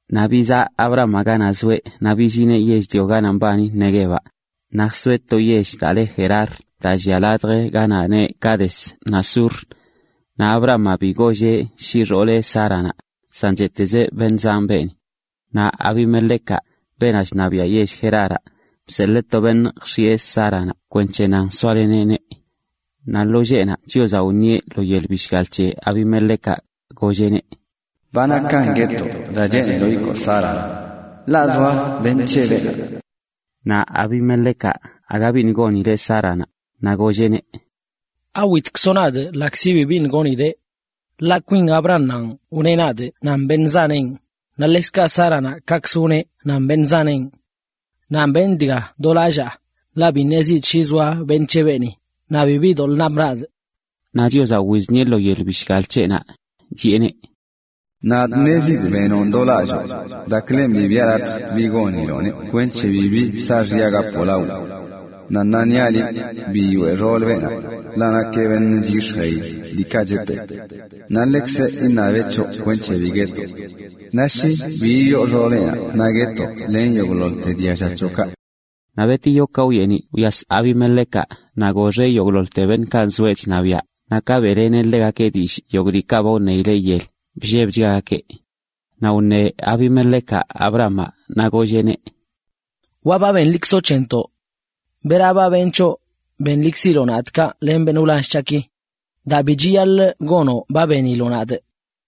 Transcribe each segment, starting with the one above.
Naꞌ bizaꞌ Abrahamaꞌ ganaꞌ zoeꞌ naꞌ billineꞌ yell-lio ganaꞌ mbani Neguevaꞌ, naꞌ jsoeꞌ to yell daa le Gerar daa llia ladj ganaꞌ neꞌ Cades naꞌ Sur. Naꞌ Abrahamaꞌ bi golleꞌ shi xooleꞌ Sáranaꞌ, san cheꞌtezeꞌ: “beṉꞌ zanꞌ beeni.” Naꞌ Abimelecaꞌ, beenaꞌ chṉabiaꞌ yell Geraraꞌ, bseḻee to beṉꞌ jx̱iꞌe Sáranaꞌ kwenc̱he nan soaleneꞌneꞌ. Naꞌ lo lleꞌnaꞌ, Chiozaꞌ wṉieꞌ lo yel bishgal c̱he Abimelecaꞌ, golleꞌneꞌ: “Ba nakan guetoꞌ daa cheeniloꞌ ikoo Sáranaꞌ, ḻaꞌ zoa beṉꞌ c̱he beenaꞌ.” Naꞌ Abimelecaꞌ aga biṉꞌ gonileꞌ Sáranaꞌ, naꞌ golleꞌneꞌ: “¿Awitkzoꞌ nadꞌ ḻaꞌkzi bi biṉꞌ gonidee? Ḻaꞌ kwinkz Abrahamaꞌ wneꞌ nadꞌ nan beṉꞌ zanenꞌ, naꞌ ḻekzkaꞌ Sáranaꞌ kaꞌkzə wneꞌ nan beṉꞌ zanenꞌ. Naꞌ benꞌ dga do lallaa, ḻaꞌ bi ṉezidꞌ shi zoa beṉꞌ c̱he beeni, naꞌ bibi doḻꞌ napꞌ nadꞌ.” Naꞌ Chiozaꞌ wiznieꞌneꞌ lo yel bishgal c̱heꞌnaꞌ, chiꞌeneꞌ: “Nadꞌ ṉezidꞌ nan liꞌ benonꞌ do lalloo, daaklen bi biꞌa latj bi goniloꞌneꞌ kweṉche bibi saaxya gapoꞌ lawii. Naꞌ ṉaa niaꞌ liꞌ, biyoꞌe xoolə beenaꞌ, ḻaꞌ nakeꞌ beṉꞌ chyix̱jee diikaꞌ chepee(). Naꞌ ḻekzeꞌ iṉabeꞌ c̱hoꞌ kwenc̱he bi guetoꞌ. Naꞌ shi bi yiyoo xooleꞌnaꞌ naꞌ guetoꞌ len yogꞌḻoḻte dialla c̱hoꞌkaꞌ.” Naꞌ betiyo ka wyeniꞌ wyas Abimelecaꞌ naꞌ goxeꞌ yogꞌḻoḻte beṉꞌkaꞌ nzoeꞌ chṉabiaꞌ, naꞌ ka beꞌleneꞌ ḻegakeꞌ dillꞌ yogꞌ diikaꞌ ba wṉeileꞌ yel, bllebchgagakeꞌ. Naꞌ wṉe Abimelecaꞌ Abrahamaꞌ naꞌ golleꞌneꞌ: ―Wa ba benlikzoꞌ c̱hentoꞌ. ¿Bera ba benꞌ c̱hoꞌ benlikziloꞌ nadꞌ kaꞌ len beṉꞌ wlall c̱haꞌki? Daa bi chiyaḻꞌ gonoꞌ ba beniloꞌ nadꞌ.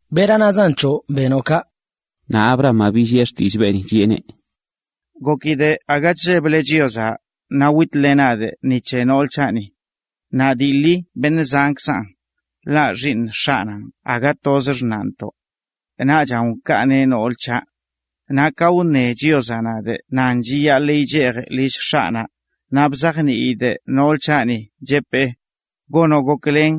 ¿Bera nazan c̱hoꞌ benoꞌ kaꞌ? Naꞌ Abrahamaꞌ billiꞌe xtillꞌ beeni, chiꞌeneꞌ: ―Gokidꞌ aga chlleble Chiozaꞌ, naꞌ witle nadꞌ ni c̱he nool c̱haꞌni. Dii ḻi beṉꞌ zankzaꞌn, ḻaꞌ xiiṉ x̱aꞌnanꞌ per aga toz xṉaꞌntoꞌ. Naꞌchan wkaaneꞌ nool c̱haꞌ. Naꞌ ka wṉe Chiozaꞌ nadꞌ nan chiyaḻꞌ yichejꞌ lill x̱aꞌnaꞌ, naꞌ bzajniidꞌ nool c̱haꞌni cheꞌpee: “Gonoꞌ goklen,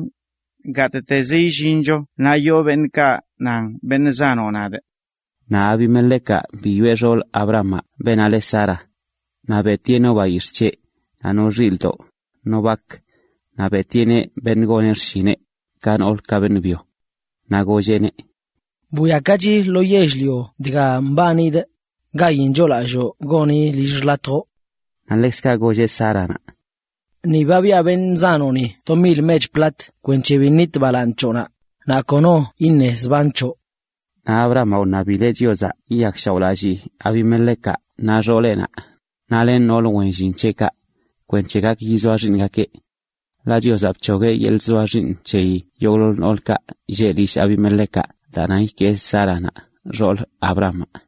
gattezə illincho naꞌ yoo beṉꞌkaꞌ nan beṉꞌ zanoꞌ nadꞌ.” Naꞌ Abimelecaꞌ biyoꞌe xool Abrahamaꞌ, beenaꞌ le Sara. Naꞌ beꞌtieꞌ no bayix̱ꞌ c̱heꞌ, no xilꞌdoꞌ, no bak, naꞌ beꞌtieꞌneꞌ beṉꞌ goneꞌ xshineꞌ, ka nool ka beṉꞌ byo. Naꞌ golleꞌneꞌ: ―Bwiakachi lo yell-lio dga mbanidꞌ, gayin choolalloo goni lill xḻatjoꞌ(ḻ). Naꞌ ḻekzkaꞌ golleꞌ Sáranaꞌ: ―Ni ba biꞌa beṉꞌ zanoꞌni to mil mech plat kwenc̱he bi nit balaaṉ c̱hoꞌnaꞌ, naꞌ kono iṉe zban c̱hoꞌ. Naꞌ Abrahamaꞌ wṉabileꞌ Chiozaꞌ yiyakshaoꞌlallii Abimelecaꞌ naꞌ xooleꞌnaꞌ len noolə wen llin c̱heꞌkaꞌ kwenc̱he gak yizoa xiiṉgakeꞌ. Ḻaꞌ Chiozaꞌ bc̱hogueꞌ yeḻꞌ chzoa xiiṉ c̱heyi yogꞌḻoḻ noolkaꞌ lleꞌ lill Abimelecaꞌ daa nan ikee Sáranaꞌ, xoolə Abrahamaꞌ.